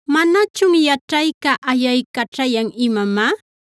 ¿Manachun yaćhayca ayaycaćhayan imamá?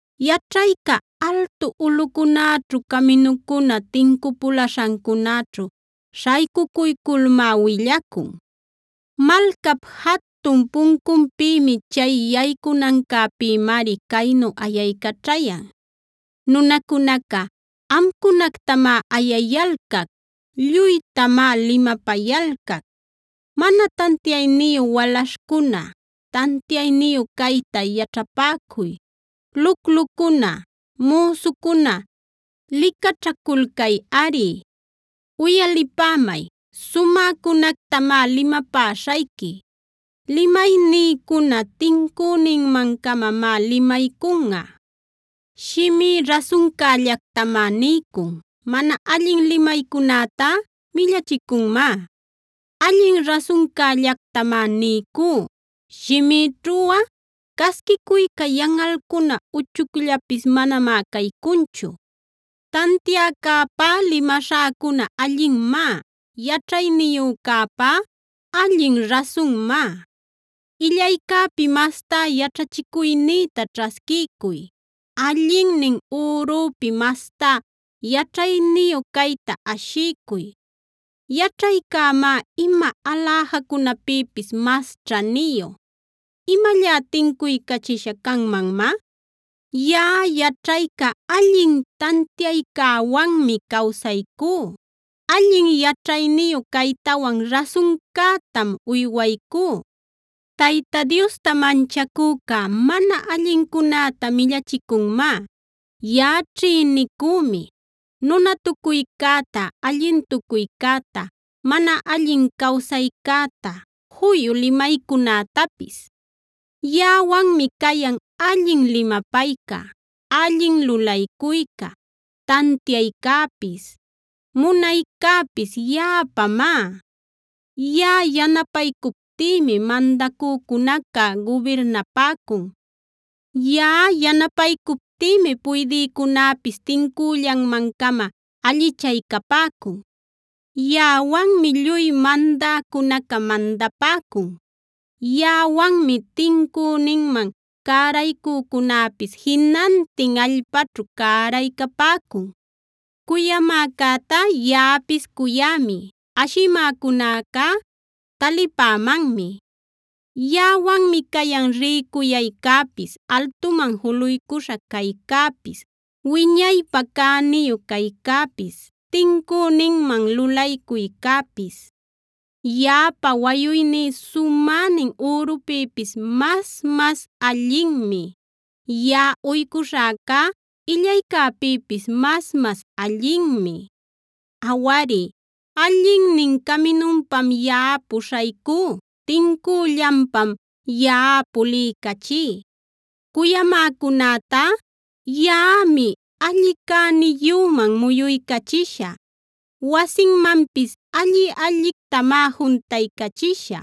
Yaćhayca altu ulꞌucunäćhu, caminucuna tincupulaśhancunaćhu śhaycucuyculmá willacun. Malcap jatun puncunpïmi, chay yaycunancäpïmari caynu ayaycaćhayan: “Nunacuna, amcunactamá ayayalcac; lluytamá limapayalcac. Mana tantiayniyu walaśhcuna, tantiayniyu cayta yaćhapäcuy; luclucuna, müsucuna licaćhaculcayꞌari. Uyalipämay, sumäcunactamá limapäśhayqui. Limaynïcuna tincüninman-camamá limaycunꞌa. Shimí rasuncällactamá niycun; mana allin limaycunätá millachicunmá. Allin rasuncällactamá niycú; shimïćhuꞌa casquicuyca, yanꞌalcuna uchucllapis manamá caycunchu. Tantiacäpá limaśhäcuna allinmá; yaćhayniyücäpá allin rasunmá. Illaycäpi mastá yaćhachicuynïta ćhasquiycuy; allinnin ürüpi mastá yaćhayniyu cayta ashiycuy. Yaćhaycämá ima aläjacunapïpis mas ćhaniyu; ¿imallá tincuycachisha canmanmá? “Yaꞌa yaćhayca allin tantiaycäwanmi cawsaycú; allin yaćhayniyu caytawan rasuncätam uywaycú. Tayta Diosta manchacüca mana allincunäta millachicunmá. Yaꞌa ćhïnicümi: nunatucuycäta, allintucuycäta, mana allin cawsaycäta, juyu limaycunätapis. Yaꞌawanmi cayan allin limapayca, allin lulaycuyca; tantiaycäpis, munaycäpis yaꞌapämá. Yaꞌa yanapaycuptïmi mandäcunaca gubirnapäcun; yaꞌa yanapaycuptïmi puydïcunäpis tincüllanman-cama allichaycapäcun. Yaꞌawanmi lluy mandäcunaca mandapäcun; yaꞌawanmi tincüninman cäraycücunäpis jinantin allpäćhu cäraycapäcun. “Cuyamäcätá yaꞌapis cuyämi; ashimäcunacá talipämanmi. Yaꞌawanmi cayan rïcuyaycäpis, altuman juluycuśha caycäpis, wiñaypä cäniyu caycäpis, tincüninman lulaycuycäpis. Yaꞌapa wayuyní sumänin ürupïpis mas-mas allinmi; yaꞌa uycuśhäcá illaycäpïpis mas-mas allinmi. Awari, allinnin caminupam yaꞌa puśhaycú; tincüllanpam yaꞌa puliycachí. Cuyamäcunätá yaꞌami alli cäniyüman muyuycachishä; wasinmanpis alli-allictamá juntaycachishä.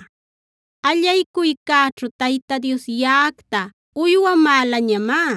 “Allaycuycäćhu Tayta Dios yaꞌacta uywamälañamá;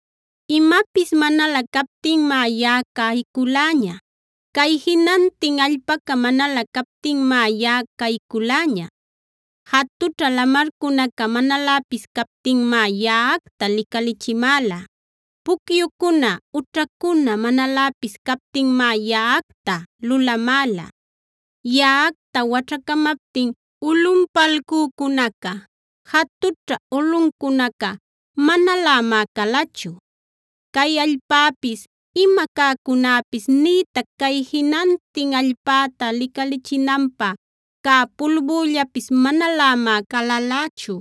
Imapis manalä captinmá yaꞌa cayculäña; cay jinantin allpaca manalä captinmá yaꞌa cayculäña. Jatućha lamarcunaca manaläpis captinmá yaꞌacta licalichimäla; pucyucuna ućhacuna manaläpis captinmá yaꞌacta lulamäla. Yaꞌacta waćhacamaptin ulꞌunpalcücunaca, jatućha ulꞌucunaca manalämá calachu. Cay allpäpis, ima cäcunäpis, nïtac cay jinantin allpäta licalichinanpä cä pulbüllapis manalämá calalächu.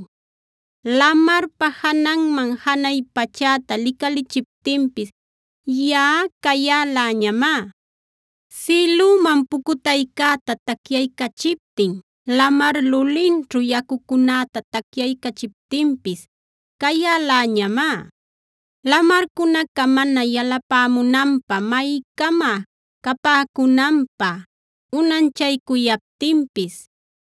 Lamarpa jananman janay pachäta licalichiptinpis, yaꞌa cayäläñamá. Sïlüman pucutaycäta tacyaycachiptin, lamar lulinćhu yacucunäta tacyaycachiptinpis cayäläñamá. Lamarcunaca mana yalapämunanpä maycama capäcunanpä unanchaycuyaptinpis,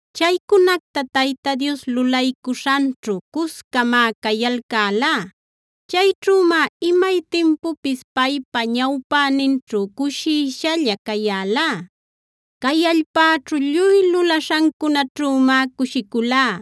Chaycunacta Tayta Dios lulaycuśhanćhu cuscamá cayalcälá; chayćhümá imay timpupis paypa ñawpäninćhu cushishalla cayälá. Cay allpäćhu lluy lulaśhancunaćhümá cushiculá;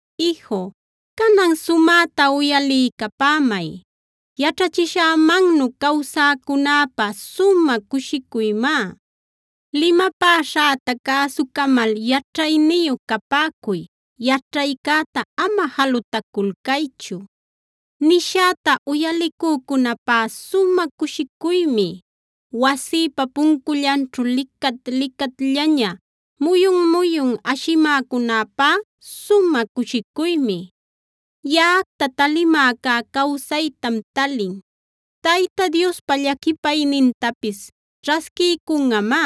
“Iju, canan sumäta uyaliycapämay, yaćhachishämannu cawsäcunäpä sumä cushicuymá. Limapäśhäta cäsucamal yaćhayniyu capäcuy; yaćhaycäta ama jalutaculcaychu. Nishäta uyalicücunäpá sumä cushicuymi; wasïpa puncullanćhu licat-licatllaña muyun-muyun ashimäcunäpá sumä cushicuymi. Yaꞌacta talimäcá cawsaytam talin; Tayta Diospa llaquipaynintapis ćhasquiycunꞌamá.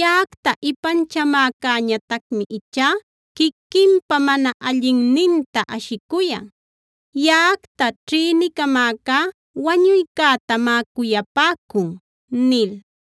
Yaꞌacta ipanchamäcäñatacmi ichá quiquinpa mana allinninta ashicuyan; yaꞌacta ćhïnicamäcá wañuycätamá cuyapäcun” nil.